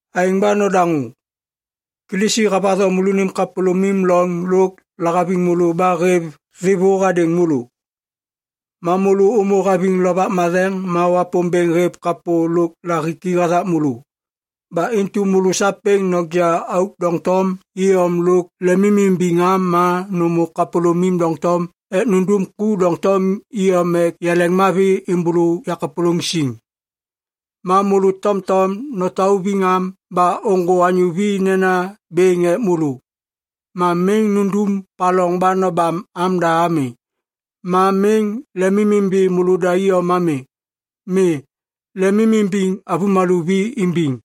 Aêŋ ba nodaŋô. Kilisi havatho môlônim kapôlômim loŋ lôk lahaviŋ môlô ba hêv thêvô hadêŋ môlô. Ma môlô ômô haviŋ Lovak Matheŋ ma Wapômbêŋ hêv kapô lôk lahiki hathak môlô. Ba intu môlô sapêŋ noja auk doŋtom iyom lôk lemimimbiŋ am ma nômô kapôlômim doŋtom ek nundum ku doŋtom iyom ek yaleŋmavi êmbôlô yakapôlôŋ siŋ. Ma môlô tomtom notauviŋ am ba ôŋgô anyô vi nena bêŋ ek môlô. Ma miŋ nundum paloŋ ba nobam amda ami. Ma miŋ lemimimbi môlôda iyom ami. Mi. Lemimimbiŋ avômalô vi imbiŋ.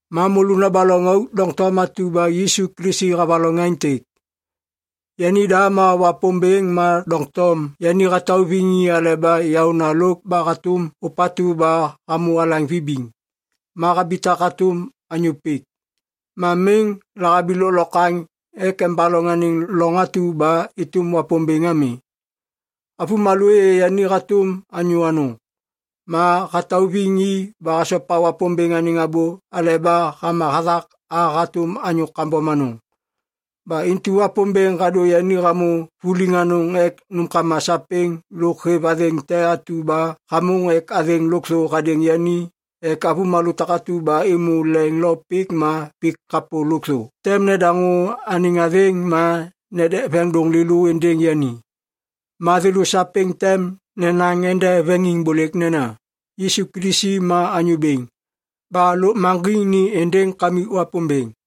Ma môlô nobaloŋ auk doŋtom atu ba Yisu Kilisi havaloŋ aêntêk. Yanida ma Wapômbêŋ ma doŋtom yani hatauviŋ i aleba yaôna lôk ba hatôm ôpatu ba hamô alaŋ vibiŋ ma habitak hatôm anyô pik. Ma miŋ lahabi lôklokwaŋ ek embaloŋ anêŋ loŋ atu ba êtôm Wapômbêŋ ami. Avômalô êyê yani hatôm anyô anôŋ, ma hatauviŋ i ba hasopa Wapômbêŋ anêŋ abô aleba hama hathak a hatôm anyô kambom anôŋ. Ba intu Wapômbêŋ hadô yani hamô vuliŋ anôŋ ek nômkama sapêŋ lôk hêv athêŋ te atu ba hamôŋ ek athêŋ lôkthô hadêŋ yani ek avômalô takatu ba êmô leŋ lo pik ma pik kapô lôkthô tem nedaŋô anêŋ athêŋ ma nedek veŋiŋdôŋ lêlô êndêŋ yani. Ma thêlô sapêŋ tem nenaŋ ende veŋiŋbôlêk nena, “Yisu Kilisi ma Anyô Bêŋ” ba lôkmaŋgiŋ ni êndêŋ Kamik Wapômbêŋ.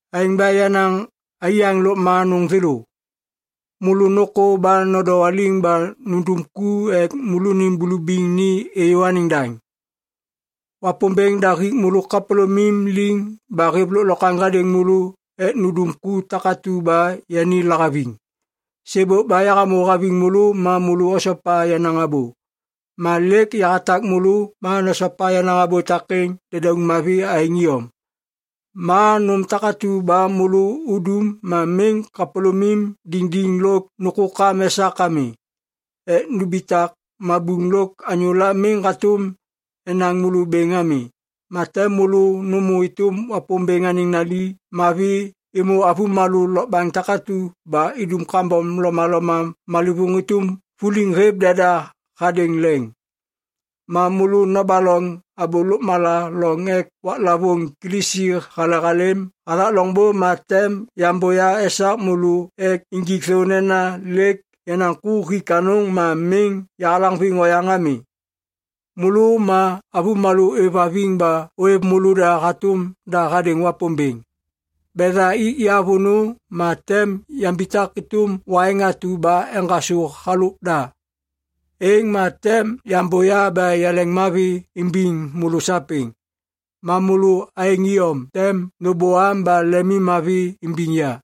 Aêŋ ba yenaŋ aiyaŋ lôkma anôŋ thêlô, môlô nôkô ba nodowaliŋ ba nundum ku ek môlônim bulubiŋ ni êyô anêŋ daŋ. Wapômbêŋ da hik môlô kapôlômim liŋ ba hêv lôklokwaŋ hadêŋ môlô ek nundum ku takatu ba yani lahaviŋ. Sêbôk ba yahamô haviŋ môlô ma môlô osopa yenaŋ abô. Ma lêk yahatak môlô ma nosopa yenaŋ abô takêŋ dedauŋ mavi aêŋ iyom. Ma nôm takatu ba môlô udum ma miŋ kapôlômim diŋdiŋ lôk nôkôkam esak ami ek numbitak mabuŋ lôk anyôla miŋ hatôm enaŋ môlô bêŋ ami. Ma tem môlô nômô êtôm Wapômbêŋ anêŋ nali mavi êmô avômalô lokbaŋ takatu ba idum kambom lomaloma malêvôŋ êtôm vuliŋ hêv deda hadêŋ leŋ. Ma môlô nobaloŋ abô lôkmala loŋ ek waklavôŋ Kilisi hale halêm hathak loŋbô ma tem yambôya esak môlô ek injik thô nena lêk yenaŋ ku hik anôŋ ma miŋ yahalaŋviŋ oyaŋ ami. Môlô ma avômalô ôêvhaviŋ ba ôêv môlôda hatôm da hadêŋ Wapômbêŋ. Betha ik ya vônô ma tem yambitak êtôm waiŋ atu ba eŋgasô halôk da. Êŋ ma tem yambôya ba yaleŋmavi imbiŋ môlô sapêŋ. Ma môlô aêŋ iyom tem nôbôam ba lemimmavi imbiŋ ya.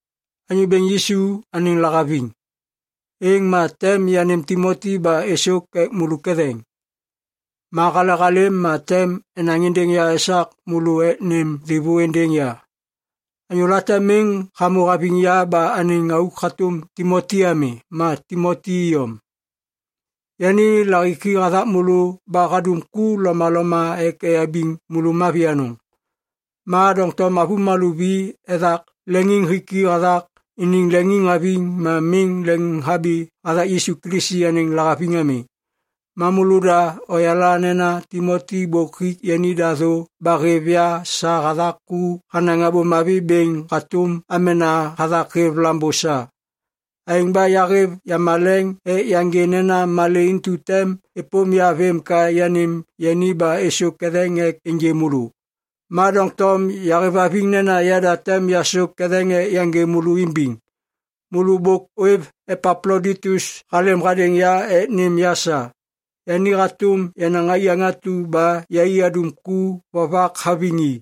Anyô Bêŋ Yisu anêŋ lahaviŋ, êŋ ma tem yanêm Timoti ba êsôk ek môlô ketheŋ. Ma halehalêm ma tem enaŋ êndêŋ ya esak môlô ek nêm thêvô êndêŋ ya. Anyô late miŋ hamô haviŋ ya ba anêŋ auk hatôm Timoti ami ma Timoti iyom. Yani lahiki hathak môlô ba hadum ku lomaloma ek eyabiŋ môlô mavi anôŋ. Ma doŋtom avômalô vi ethak leŋiŋhiki hathak iniŋ leŋiŋhaviŋ ma miŋ leŋhabi hathak Yisu Kilisi anêŋ lahaviŋ ami. Ma môlôda oyala nena Timoti bôk hik yanida thô ba hêv ya sa hathak ku hanaŋ Abô Mavi bêŋ hatôm amena hathak hêv lambô sa. Aêŋ ba yahêv yamaleŋ ek yaŋgê nena malê intu tem êpôm ya vêm ka yanêm yani ba êsôk ketheŋ ek ênjê môlô. Ma doŋtom yahêvhaviŋ nena yada tem yasôk ketheŋ ek yaŋgê môlô imbiŋ. Môlô bôk ôêv Epaploditus halêm hadêŋ ya ek nêm ya sa. Yani hatôm yenaŋ aiyaŋ atu ba yai adum ku vovak haviŋ i.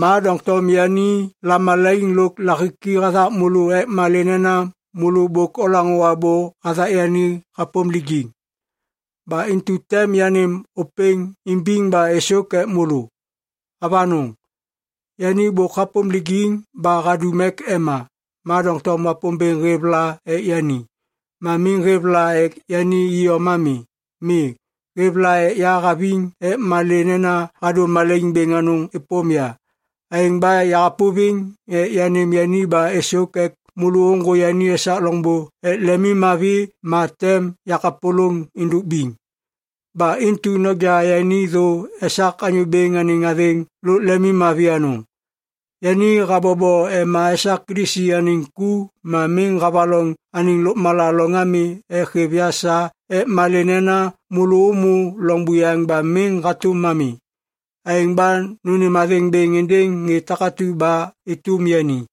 Ma doŋtom yani lamalaiŋ lôk lahiki hathak môlô ek malê nena môlô bôk olaŋô abô hathak yani hapôm lijiŋ. Ba intu tem yanêm ôpêŋ imbiŋ ba êsôk ek môlô. Avanôŋ, yani bôk hapôm lijiŋ ba hadum ek ema, ma doŋtom Wapômbêŋ hêv la ek yani. Ma miŋ hêv la ek yani iyom ami. Mi. Hêv la ek ya haviŋ ek malê nena hadô malaiŋ bêŋ anôŋ êpôm ya. Aêŋ ba yahapôviŋ ek yanêm yani ba êsôk ek môlô ôŋgô yani esak loŋbô ek lemimmavi ma tem yakapôlôŋ êndôk biŋ. Ba intu noja yani thô esak Anyô Bêŋ anêŋ athêŋ lôk lemimmavi anôŋ. Yani habobo ema esak Kilisi anêŋ ku ma miŋ havaloŋ anêŋ lôkmala loŋ ami ek hêv ya sa ek malê nena môlô ômô loŋ buyaŋ ba miŋ hatôm ami. Aêŋ ba nônêm athêŋ bêŋ êndêŋ ŋê takatu ba êtôm yani.